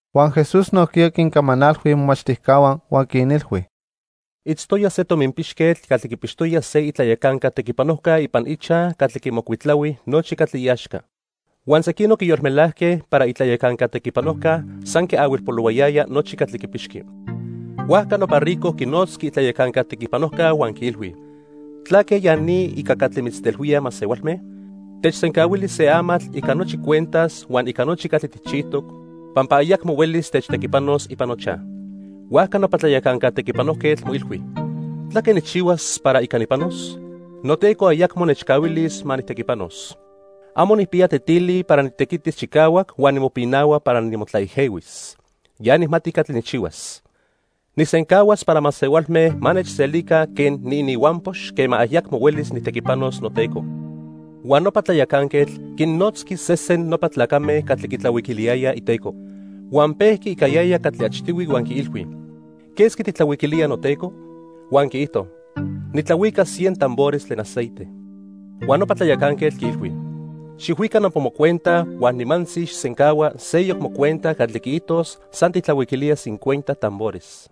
Huan Jesús nojquiya quincamanalhui imomachtijcahua huan quinilhui: "Itztoya se tominpixquetl catli quipixtoya se itlayacanca tequipanojca ipan ichaj catli quimocuitlahui nochi catli iaxca. Huan sequinoc quiyolmelajque para itlayacanca tequipanojca san quiahuilpolohuayaya nochi catli quipixqui. Huajca nopa rico quinotzqui itlayacanca tequipanojca huan quiilhui: '¿Tlaque ya ni ica catli mitztelhuíaj masehualme? Techsencahuili se amatl ica nochi cuentas huan ica nochi catli tijchijtoc, pampa ayacmo huelis techtequipanos ipan nochaj.' "Huajca nopa tlayacanca tequipanojquetl moilhui: '¿Tlaque nijchihuas para ica nipanos? Noteco ayacmo nechcahuilis ma nijtequipanos. Amo nijpiya tetili para nitequitis chicahuac huan nimopinahua para nimotlaejehuis. Ya nijmati catli nijchihuas. Nijsencahuas para masehualme ma nechselica quen niininhuampox quema ayacmo huelis nijtequipanos noteco.' "Huan nopa tlayacanquetl quinnotzqui sesen nopa tlacame catli quitlahuiquiliyayaj iteco. Huan pejqui ica yaya catli achtihui huan quiilhui: '¿Quesqui tijtlahuiquilía noteco?' Huan quiijto: 'Nitlahuica cien tambores tlen aceite.' Huan nopa tlayacanquetl quiilhui: 'Xijhuica nopa mocuenta huan nimantzi xijsencahua seyoc mocuenta catli quiijtos san tijtlahuiquilía cincuenta tambores.'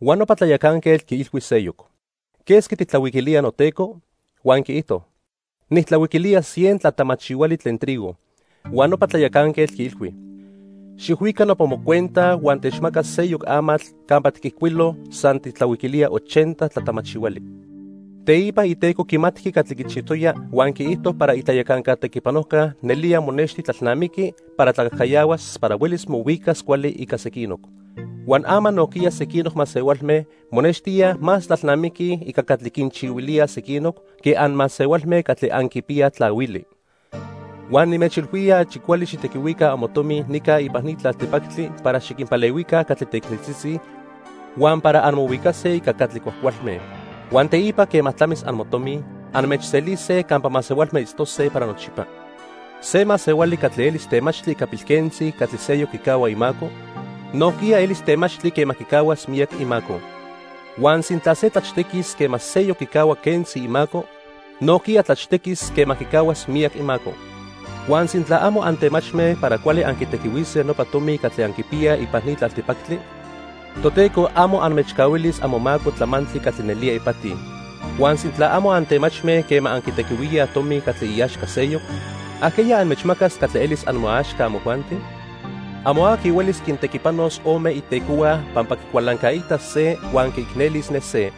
Huan nopa tlayacanquetl quiilhui seyoc: '¿Quesqui tijtlahuiquilía noteco?' Huan quiijto: 'Nijtlahuiquilía cien tlatamachihuali tlen trigo.' Huan nopa tlayacanquetl quiilhui: 'Xijhuica nopa mocuenta huan techmaca seyoc amatl campa tiquijcuilo san tijtlahuiquilía ochenta tlatamachihuali.' Teipa iteco quimatqui catli quichijtoya huan quiijto para itlayacanca tequipanojca nelía monexti tlalnamiqui para tlacajcayahuas para huelis mohuicas cuali ica sequinoc. Huan ama nojquiya sequinoc masehualme monextíaj más tlalnamiquij ica catli quinchihuilíaj sequinoc que anmasehualme catli anquipiyaj tlahuili. "Huan nimechilhuía achi cuali xijtequihuica amotomi nica ipan ni tlaltipactli para xiquinpalehuica catli teicneltzitzi huan para anmohuicase ica catli cuajcualme. Huan teipa quema tlamis amotomi, anmechselise campa masehualme itztose para nochipa. "Se masehuali catli elis temachtli ica pilquentzi catli seyoc quicahua imaco, nojquiya elis temachtli quema quicahuas miyac imaco. Huan sintla se tlachtequis quema seyoc quicahua quentzi imaco, nojquiya tlachtequis quema quicahuas miyac imaco. Huan sintla amo antemachme para cuali anquitequihuise nopa tomi catli anquipiyaj ipan ni tlaltipactli, Toteco amo anmechcahuilis amomaco tlamantli catli nelía ipati. Huan sintla amo antemachme quema anquitequihuíaj tomi catli iaxca seyoc, ¿ajqueya anmechmacas catli elis amoaxca amojuanti? "Amo aqui huelis quintequipanos ome itecohua pampa quicualancaitas se huan quiicnelis ne se.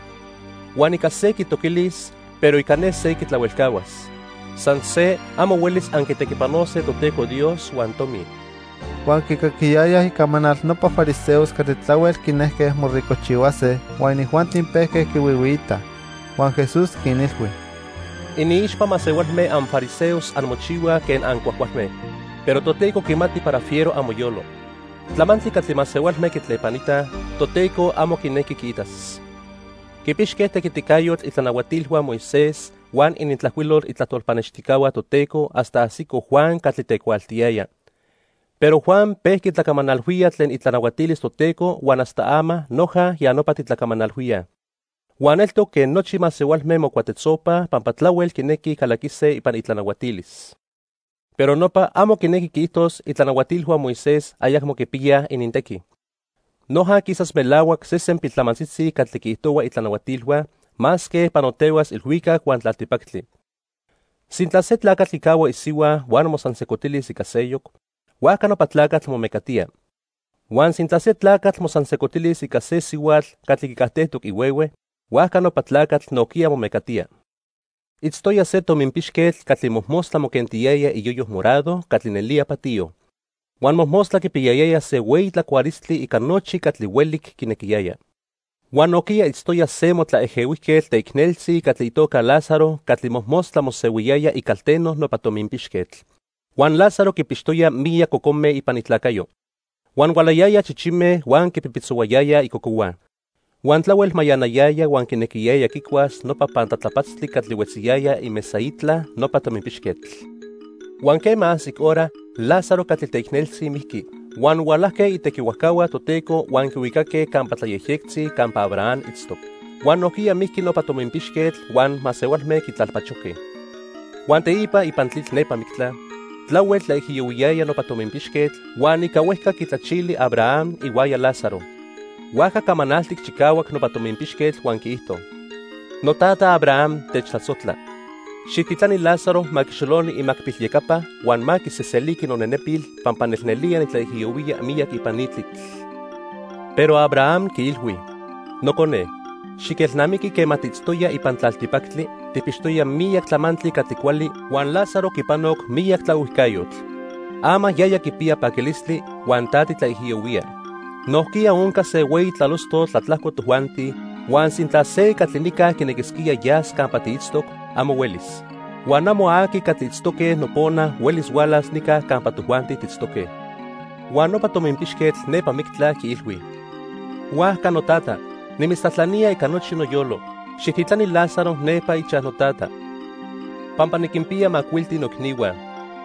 Huan ica se quitoquilis, pero ica ne se quitlahuelcahuas. San se, amo huelis anquitequipanose Toteco Dios huan tomi." Huan quicaquiyayaj icamanal nopa fariseos catli tlahuel quinejque moricojchihuase huan inijuanti pejque quihuihuiitaj. Huan Jesús quinilhui: "Iniixpa masehualme anfariseos anmochihuaj quen ancuajcualme, pero Toteco quimati para fiero amoyolo. Tlamantli catli masehualme quitlepanitaj, Toteco amo quinequi quiitas. "Quipixque tequiticayotl itlanahuatilhua Moisés huan inintlajcuilol itlajtol pannextijcahua Toteco hasta ajsico Juan catli tecuaaltiyaya. Pero Juan pejqui tlacamanalhuía tlen itlanahuatilis Toteco huan hasta ama noja ya nopa titlacamanalhuíaj. Huan eltoc quen nochi masehualme mocuatetzopaj pampa tlahuel quinequij calaquise ipan itlanahuatilis. "Pero nopa amo quinequi quiijtos itlanahuatilhua Moisés ayacmo quipiyaj inintequi. Noja quisas melahuac sesen piltlamantzitzi catli quiijtohua itlanahuatilhua, masque panotehuas ilhuicac huan tlaltipactli. "Sintla se tlacatl quicahua isihua huan mosansejcotilis ica seyoc, huajca nopa tlacatl momecatía. Huan sintla se tlacatl mosansejcotilis ica se sihuatl catli quicajtejtoc ihuehue, huajca nopa tlacatl nojquiya momecatía. "Itztoya se tominpixquetl catli mojmostla moquentiyaya iyoyo morado catli nelía patiyo. Huan mojmostla quipiyayaya se hueyi tlacualistli ica nochi catli huelic quinequiyaya. Huan nojquiya itztoya se motlaejehuijquetl teicneltzi catli itoca Lázaro catli mojmostla mosehuiyaya icalteno nopa tominpixquetl. Huan Lázaro quipixtoya miyac cocome ipan itlacayo. Huan hualayayaj chichime huan quipipitzohuayayaj icocohua. Huan tlahuel mayanayaya huan quinequiyaya quicuas nopa pantlatlapatztli catli huetziyaya imesaitla nopa tominpixquetl. Huan quema ajsic hora, Lázaro catli teicneltzi mijqui huan hualajque itequihuajcahua Toteco huan quihuicaque campa tlayejyectzi campa Abraham itztoc. Huan nojquiya mijqui nopa tominpixquetl huan masehualme quitlalpachojque. Huan teipa ipan tlitl nepa mictla, tlahuel tlaijiyohuiyaya nopa tominpixquetl, huan ica huejca quitlachili Abraham ihuaya Lázaro. Huajca camanaltic chicahuac nopa tominpixquetl huan quiijto: 'Notata Abraham, techtlasojtla. Xijtitlani Lázaro ma quixoloni imacpilyecapa huan ma quiseseliqui nonenepil pampa nelnelía nitlaijiyohuía miyac ipan ni tlitl.' Pero Abraham quiilhui: 'Nocone, xiquelnamiqui quema tiitztoya ipan tlaltipactli, tijpixtoya miyac tlamantli catli cuali huan Lázaro quipanoc miyac tlaohuijcayotl. Ama yaya quipiya paquilistli, huan ta titlaijiyohuía. Nojquiya onca se hueyi tlalostotl tlatlajco tojuanti huan sintla se catli nica quinequisquía yas campa tiitztoc, amo huelis. Huan amo aqui catli itztoque nopona huelis hualas nica campa tojuanti tiitztoque.' "Huan nopa tominpixquetl nepa mictla quiilhui: 'Huajca, notata, nimitztlajtlanía ica nochi noyolo, xijtitlani Lázaro nepa ichaj notata. Pampa niquinpiya macuilti noicnihua.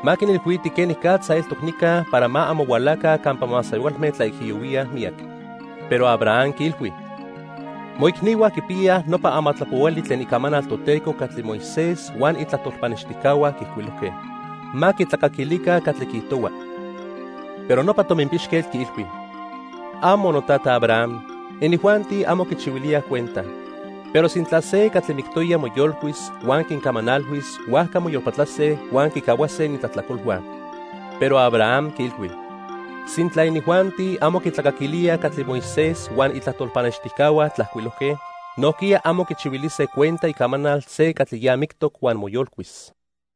Ma quinilhuiti quenicatza eltoc nica para ma amo hualaca campa masehualme tlaijiyohuíaj miyac.' Pero Abraham quiilhui: 'Moicnihua quipiyaj nopa amatlapohuali tlen Icamanal Toteco catli Moisés huan itlajtol pannextijcahua quiijcuilojque. Ma quitlacaquilica catli quiijtohua.' Pero nopa tominpixquetl quiilhui: '¡Amo! Notata Abraham, inijuanti amo quichihuilíaj cuenta. Pero sintla se catli mictoya moyolcuis huan quincamanalhuis, huajca moyolpatlase huan quicahuase inintlajtlacolhua.' Pero Abraham quiilhui: 'Sintla inijuanti amo quitlacaquilíaj catli Moisés huan itlajtol pannextijcahua tlajcuilojque, nojquiya amo quichihuilise cuenta icamanal se catli ya mictoc huan moyolcuis.' "